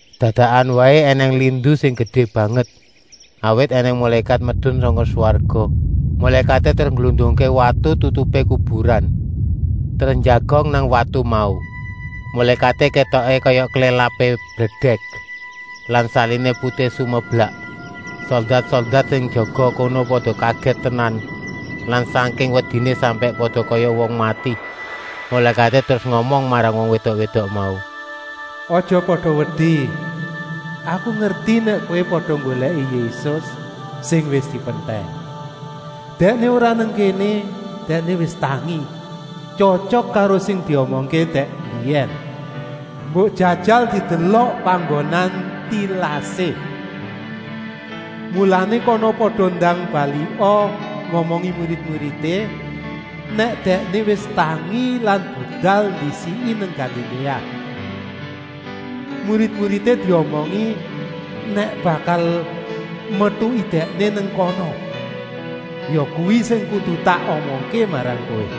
Dadakan waé ènèng lindu sing gedé banget, awit ènèng mulékat medun sangka swarga. Mulékaté terus ngglundungké watu tutupé kuburan, terus njagong nang watu mau. Mulékaté kétoké kaya klélapé bledèk lan saliné putih sumeblak. Soldat-soldat sing jaga kono pada kagèt tenan lan sangking wediné sampèk pada kaya wong mati. Mulékaté terus ngomong marang wong wédok-wédok mau: “Aja pada wedi! Aku ngerti nèk kowé pada nggolèki Yésus sing wis dipentèng. Dèkné ora nang kéné, Dèkné wis tangi, tyotyok karo sing diomongké dèk mbiyèn. Mbok jajal didelok panggonan tilasé. Mulané kana pada ndang balika ngomongi murid-muridé nèk Dèkné wis tangi lan budal ndisiki nang Galiléa. Murid-muridé diomongi nèk bakal metuki Dèkné nang kana. Yakuwi sing kudu tak omongké marang kowé.”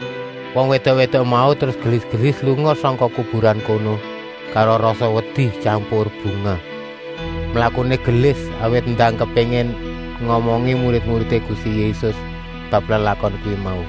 Wong wédok-wédok mau terus gelis-gelis lunga sangka kuburan kono karo rasa wedi tyampur bungah. Mlakuné gelis, awit ndang kepéngin ngomongi murid-muridé Gusti Yésus bab lelakon kuwi mau.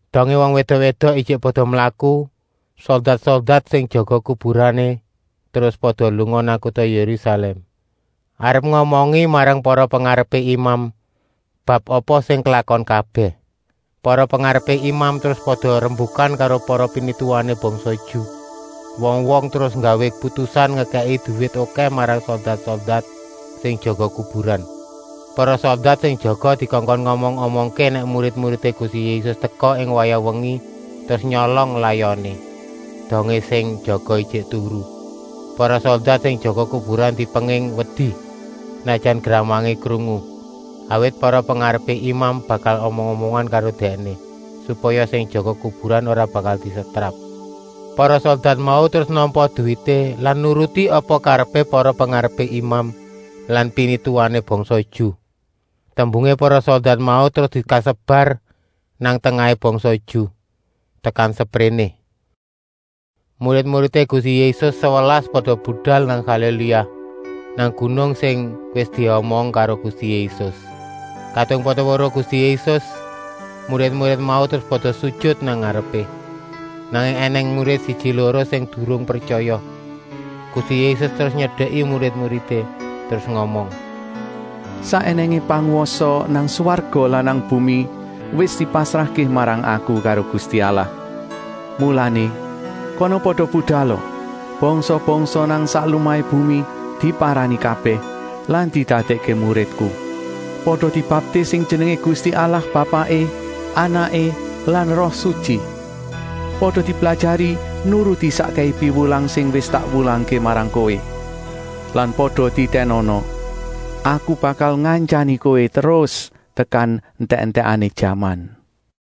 Dongé wong wédok-wédok ijik pada mlaku, soldat-soldat sing jaga kuburan terus pada lunga nang kuta Yérusalèm, arep ngomongi marang para pengarepé imam bab apa sing klakon kabèh. Para pengarepé imam terus pada rembukan karo para pinituwané bangsa Ju. Wong-wong terus nggawé putusan ngekèki duwit okèh marang soldat-soldat sing jaga kuburan. Para soldat sing jaga dikongkon ngomong-omongké nèk murid-muridé Gusti Yésus teka ing wayah wengi terus nyolong layoné, dongé sing jaga ijik turu. Para soldat sing jaga kuburan dipenging wedi, senajan gramangé krungu, awit para pengarepé imam bakal omong-omongan karo dèkné, supaya sing jaga kuburan ora bakal disetrap. Para soldat mau terus nampa duwité lan nuruti apa karepé para pengarepé imam lan pinituwané bangsa Ju. Tembungé para soldat mau terus kesebar nang tengahé bangsa Ju, tekan sepréné. Murid-muridé Gusti Yésus sewelas pada budal nang Galiléa, nang gunung sing wis diomong karo Gusti Yésus. Kadung pada weruh Gusti Yésus, murid-murid mau terus pada sujut nang ngarepé. Nanging ènèng murid siji-loro sing durung pretyaya. Gusti Yésus terus nyedeki murid-muridé, terus ngomong: “Sak ènèngé pangwasa nang swarga lan nang bumi wis dipasrahké marang Aku karo Gusti Allah. Mulané, kana pada budala, bangsa-bangsa nang sak lumahé bumi diparani kabèh lan didadèkké muridku. Pada dibaptis ing jenengé Gusti Allah Bapaké, Anaké lan Roh Sutyi. Pada diblajari nuruti sakkèhé piwulang sing wis tak wulangké marang kowé. Lan pada titènana, Aku bakal ngantyani kowé terus tekan entèk-entèkané jaman.”